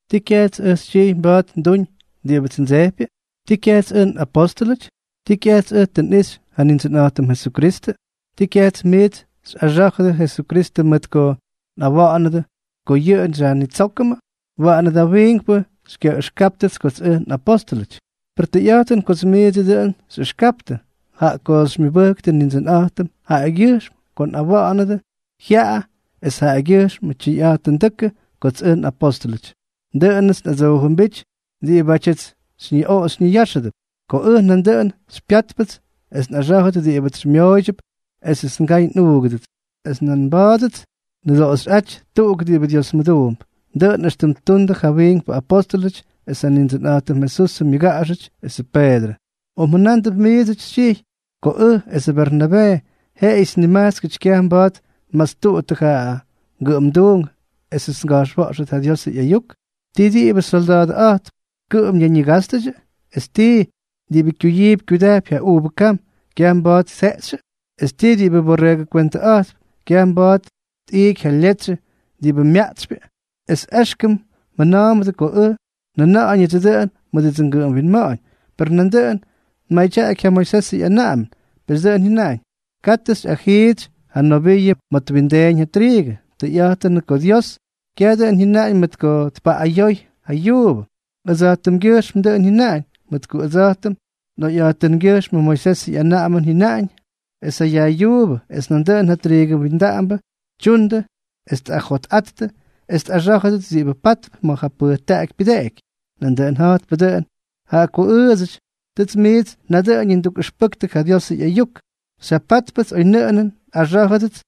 ¿Tii kyajts ʉj xytyijy mba̱a̱t nduñ diꞌibʉts ndsejpyʉ? ¿Tii kyajts ʉj nꞌapóstʉlʉty? ¿Tii kyajts ʉj tʉ nꞌixy ja Nindsʉnꞌa̱jtʉm Jesukristʉ? ¿Tii kyaj miits xyꞌaxá̱jʉdʉ Jesukristʉ mʉt ko nꞌawa̱ꞌa̱nʉdʉ ko yʉꞌʉ xyajnitsókʉmʉ? Waꞌanʉ da wiinkpʉ xykyaꞌʉxkáptʉts kots ʉj nꞌapóstʉlʉty; per tʉyꞌa̱jtʉn kots miidsʉ dʉꞌʉn xyꞌʉxkaptʉ, jaꞌa ko xymyʉbʉktʉ Nindsʉnꞌa̱jtʉm jaꞌagyʉjxm ko nꞌawa̱ꞌa̱nʉdʉ jyaꞌa es jaꞌagyʉjxm tyʉyꞌa̱jtʉndʉ́kʉ kots ʉj nꞌapóstʉlʉty. Dʉꞌʉnʉts nꞌadsoojʉmbíty diꞌibátyʉts xyñiꞌoꞌo xyñiyáxʉdʉp. Ko ʉj nandʉꞌʉn xypyátpʉts es nꞌaxá̱jʉt diꞌibʉts xymyooydyʉp esʉts ngay nꞌuugʉdʉts, es nan mba̱a̱dʉts nnʉdoꞌoxyꞌáty tuꞌuk diꞌibʉ Diosmʉduump, dʉꞌʉn éxtʉm ttundʉ ja wiinkpʉ apóstʉlʉty es ja Nindsʉnꞌa̱jtʉm Jesusʉ myʉgaꞌaxʉty esʉ Peedrʉ. ¿O mjʉnándʉp miidsʉty xytyijy ko ʉj esʉ Bernabee, jeꞌeyʉts nimajtskʉty kyaj mba̱a̱t nmastuꞌuttʉ ja ngʉꞌʉmduunk esʉts nga̱jxwa̱ꞌxtʉt ja Diosʉ ꞌyayuk? ¿Tii, diꞌibʉ solda̱a̱dʉꞌa̱jtp kʉꞌʉm ñayñigástʉdyʉ? ¿Es tii, diꞌibʉ kyuyiipy kyudajpy ja uuvʉ kam kyaj mba̱a̱t tjeꞌxyʉ? ¿Es tii, diꞌibʉ borreegʉkwentʉꞌa̱jtp kyaj mba̱a̱t tꞌiiky ja letsyʉ diꞌibʉ myaꞌtsypyʉ? Es éxkʉm mjʉna̱a̱mbʉdʉ ko ʉj njʉna̱ꞌa̱ñʉdsʉ dʉꞌʉn mʉdʉdsʉ ngʉꞌʉm winma̱ꞌa̱ñ, per nandʉꞌʉn tmadyaꞌaky ja Moisesʉ ꞌyanaꞌamʉn. Pes dʉꞌʉn jyʉnaꞌañ: “Katʉ xyꞌajiitsy ja noviiʉ ma̱ twindeeñ ja triigʉ.” Tʉyꞌa̱jtʉnʉꞌʉ ko Dios kyaj dʉꞌʉn jyʉnaꞌañ mʉt ko tpaꞌꞌayoy ja yuubʉ, ʉdsa̱jtʉmgyʉjxmʉty dʉꞌʉn jyʉnáñ; mʉt ko ʉdsa̱jtʉm nꞌoyꞌa̱jtʉngyʉjxm Moisesʉ ꞌyanaꞌamʉn jyʉnaꞌañ es ja yajꞌyuubʉ es nandʉꞌʉn ja triigʉ windaꞌambʉ tyundʉ es tꞌajotꞌattʉ es tꞌaxá̱jʉdʉt diꞌibʉ pátʉp ma̱ ja pʉjtaꞌaky pyʉdeꞌeky. Nandʉꞌʉn ja̱jtpʉ dʉꞌʉn, jaꞌa ko ʉʉdsʉty, tʉts miits nadʉꞌʉñʉ ndukꞌʉxpʉktʉ ja Diosʉ ꞌyayuk, xyjapátpʉts oynʉꞌʉnʉn nꞌaxá̱jʉdʉts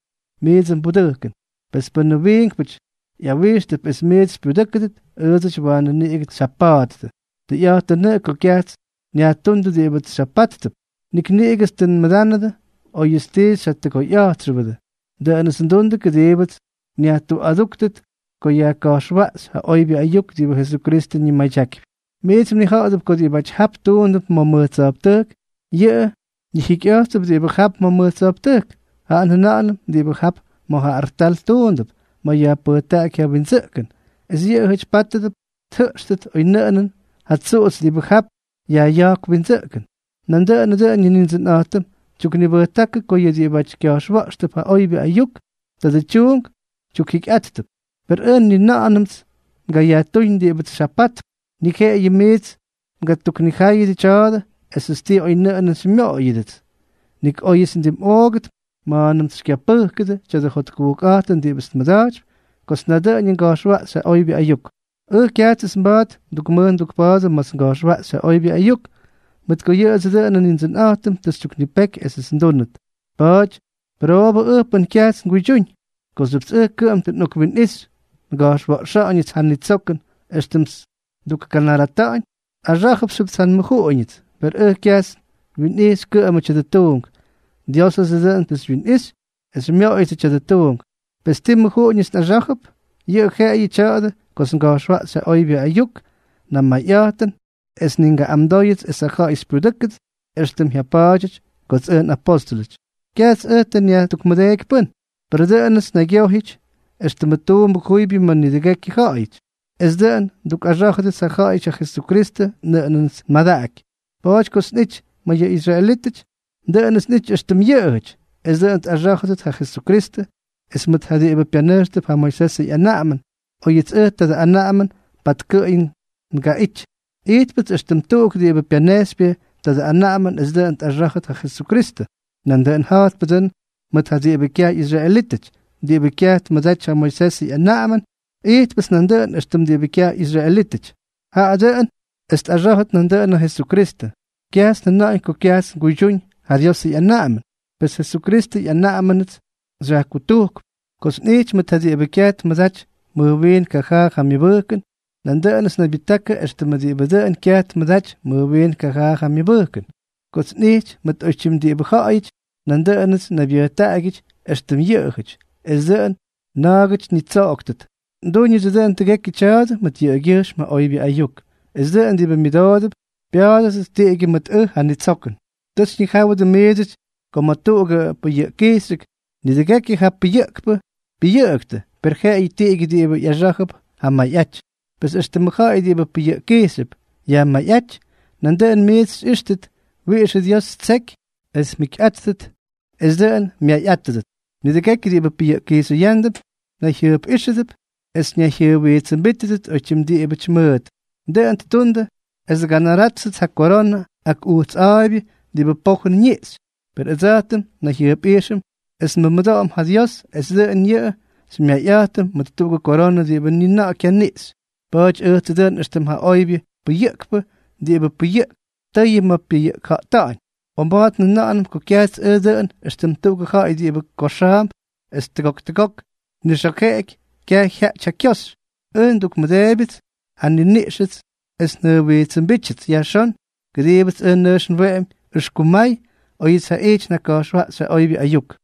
miidsʉ mbudʉjkʉn. Pes pʉnʉ wiinkpʉty ꞌyawijxtʉp es miits xypyudʉ́kʉdʉt, ʉʉdsʉty waanʉ niꞌigʉts xyjapa̱a̱ttʉ. Tʉyꞌa̱jtʉnʉꞌʉ ko kyajts nyajtuundʉ diꞌibʉts xyjapáttʉp. Nik niꞌigʉts tʉ nmʉdánʉdʉ óyʉts ti xyjatʉgoyꞌa̱jtxʉbʉdʉ. Dʉꞌʉnʉts ndundʉ kʉdiibʉts nyajtuꞌadúktʉt ko yajka̱jxwaꞌxy ja oybyʉ ayuk diꞌibʉ Jesukristʉ ñimadyakypy. Miits mnija̱ꞌa̱dʉp ko diꞌibáty jap tuundʉp ma̱ mʉj tsa̱jptʉjk, yʉꞌʉ ñijikyꞌa̱jttʉp diꞌibʉ jap ma̱ mʉj tsa̱jptʉjk. Jaꞌa njʉna̱ꞌa̱nʉm diꞌibʉ jap ma̱ ja artal tuundʉp ma̱ yajpʉjtaꞌaky ja windsʉꞌkʉn, es yʉꞌʉjʉty pátʉdʉp tjʉꞌxtʉt oynʉꞌʉnʉn ja tsuꞌutsy diꞌibʉ jap yajꞌya̱jkp windsʉꞌkʉn. Nandʉꞌʉnʉ dʉꞌʉn yʉ Nindsʉnꞌa̱jtʉm tyuknibʉjtákʉ ko yʉ diꞌibáty kya̱jxwa̱ꞌxtʉp ja oybyʉ ayuk, tadʉ tyuunk tyukjikyꞌáttʉp. Per ʉj ni na̱ꞌa̱nʉmts ngayajtúñ diꞌibʉts xyjapatp, ni jeꞌeyʉts miits ngatuknijáyʉdʉ tya̱a̱dʉ esʉts ti oynʉꞌʉnʉn xymyoꞌoydyʉdʉts. Nik óyʉts ndimꞌoogʉt ma̱a̱nʉmts xykyapʉjkʉdʉ tya̱dʉ jotkujkꞌa̱jtʉn diꞌibʉts nmʉda̱jtypy kots nadʉꞌʉñʉ nga̱jxwaꞌxy ja oybyʉ ayuk. Ʉj kyajts mba̱a̱t ndukmʉj ndukpa̱a̱dʉ ma̱ts nga̱jxwaꞌxy ja oybyʉ ayuk, mʉt ko yʉꞌʉdsʉ dʉꞌʉnʉ Nindsʉnꞌa̱jtʉm tʉ xytyuknipeky esʉts ndúnʉt. ¡Pa̱a̱ty, pʉroobʉ ʉj pʉn kyajts nguydyúñ! Kooxyʉpts ʉj kʉꞌʉm tʉ nꞌokwinꞌixy nga̱jxwa̱ꞌxa̱ꞌa̱ñʉts ja nitsokʉn éxtʉmts ndukganarata̱ꞌa̱ñ, nꞌaxá̱jʉpxyʉpts ja nmʉjuꞌuñʉts; per ʉj kyajts nwinꞌijxy kʉꞌʉmʉ tya̱dʉ tuunk, Diósʉdsʉ dʉꞌʉn xywyinꞌijx es xymyooyʉdsʉ tya̱dʉ tuunk. Pes, ¿ti mʉjuꞌuñʉts nꞌaxá̱jʉp? Yʉꞌʉ jeꞌeyʉ tya̱a̱dʉ kots nga̱jxwaꞌxy ja oybyʉ ayuk namayꞌa̱jtʉn es ni ngaꞌꞌamdóyʉts esʉ ja̱ꞌa̱y xypyudʉ́kʉdʉt éxtʉmts xyjapa̱a̱ty kots ʉj nꞌapóstʉlʉty. Kyajts ʉj tʉ nyajtukmʉdeeky pʉ́n; per dʉꞌʉnʉts nnaygyojyʉty éxtʉmʉ tuumbʉ juybyʉ ma̱ nidʉgekyʉ ja̱ꞌa̱yʉty, es dʉꞌʉn ndukꞌaxá̱jʉdʉts ja ja̱ꞌa̱yʉty ja Jesukristʉ nʉꞌʉnʉts nmadaꞌaky. Pa̱a̱ty kots nꞌity ma̱ yʉ israelítʉty, dʉꞌʉnʉts nꞌity éxtʉm yʉꞌʉjʉty, es dʉꞌʉn tꞌaxá̱jʉdʉt ja Jesukristʉ; es mʉt ja diꞌibʉ pyanʉjxtʉp ja Moisesʉ ꞌyanaꞌamʉn, óyʉts ʉj tadʉ anaꞌamʉn patkʉꞌʉy ngaꞌity, ijtpʉts éxtʉm tuꞌuk diꞌibʉ pyanejxypyʉ tadʉ anaꞌamʉn es dʉꞌʉn tꞌaxá̱jʉdʉt ja Jesukristʉ. Nandʉꞌʉn ja̱jtpʉ dʉꞌʉn mʉt ja diꞌibʉ kyaj ꞌyisraelítʉty diꞌibʉ kyaj tmʉdaty ja Moisesʉ ꞌyanaꞌamʉn, ijtpʉts nandʉꞌʉn éxtʉm diꞌibʉ kyaj ꞌyisraelítʉty, jaꞌa dʉꞌʉn es tꞌaxá̱jʉdʉt nandʉꞌʉn ja Jesukristʉ. Kyajts njʉna̱ꞌa̱ñ ko kyajts nguydyúñ ja Diosʉ ꞌyanaꞌamʉn; pes Jesukristʉ ꞌyanaꞌamʉnʉts xyajkutujkp. Kots nꞌijty mʉt ja diꞌibʉ kyaj tmʉdaty mʉj wiin kajaa ja myʉbʉjkʉn, nandʉꞌʉnʉts nnaybyʉjtákʉ éxtʉm diꞌibʉ dʉn kyaj tmʉdaty mʉj wiin kajaa ja myʉbʉjkʉn. Kots nꞌijty mʉt oytyim diꞌibʉ ja̱ꞌa̱yʉty, nandʉꞌʉnʉts nnaybyʉjtaꞌagyʉty éxtʉm yʉꞌʉjʉty, es dʉꞌʉn na̱a̱gʉty ñitsoꞌoktʉt. Ndúñʉts dʉꞌʉn tʉgekyʉ tya̱a̱dʉ mʉt yʉꞌʉgyʉjxm ja oybyʉ ayuk, es dʉꞌʉn diꞌibʉ myʉdoodʉp pya̱a̱dʉdʉt tiꞌigyʉ mʉt ʉj ja nitsokʉn. Tʉ xyñijáwʉdʉ miidsʉty ko ma̱ tuꞌugʉ pʉyʉꞌkkijxyʉk, nidʉgekyʉ ja pʉyʉꞌkpʉ pyʉyʉꞌʉktʉ, per jeꞌeyʉ tiꞌigyʉ diꞌibʉ ꞌyaxá̱jʉp ja mayꞌaty. Pes éxtʉmʉ ja̱ꞌa̱y diꞌibʉ pʉyʉꞌkkijxyʉp yajmayꞌáty, nandʉꞌʉn miits xyꞌíxtʉt wiꞌixʉ Dios ttseky es mjikyꞌáttʉt, es dʉꞌʉn mmayꞌátʉdʉt. Nidʉgekyʉ diꞌibʉ pʉyʉꞌkkijxyʉyándʉp, nayjyʉjpꞌijxʉdʉp es nayjyʉjwijtsʉmbijtʉdʉp oytyim diꞌibʉty mʉʉt. Dʉꞌʉn ttundʉ es tganaráttʉt ja koronʉ ak ujts a̱a̱ybyʉ diꞌibʉ pojʉn ñiꞌxy; per ʉdsa̱jtʉm nnayjyʉjpꞌijxʉm es nmʉmʉdoꞌom ja Dios es dʉꞌʉn yʉꞌʉ xymyayꞌa̱jtʉm mʉt tuꞌugʉ koronʉ diꞌibʉ ni na̱ꞌa̱ kyaniꞌxy. Pa̱a̱ty ʉjtsʉ dʉꞌʉn éxtʉm ja oybyʉ pʉyʉꞌkpʉ diꞌibʉ pʉyʉꞌkp tʉyʉ ma̱ pyʉyʉꞌkja̱ꞌta̱ꞌa̱ñ. O mba̱a̱t njʉna̱ꞌa̱nʉm ko kyajts ʉj dʉꞌʉn éxtʉm tuꞌugʉ ja̱ꞌa̱y diꞌibʉ koxa̱a̱mp es tʉgok tʉgok tnixa̱jeꞌeky, kyaj jyaꞌty ja kyoxy. Ʉj ndukkumʉdeebyʉts ja nniniꞌxʉts es njʉjwijtsʉmbítyʉts yajxón, kʉdiibʉts ʉj nʉjx nweꞌemy ʉxkumay óyʉts jaꞌijty njaka̱jxwaꞌxy ja oybyʉ ayuk.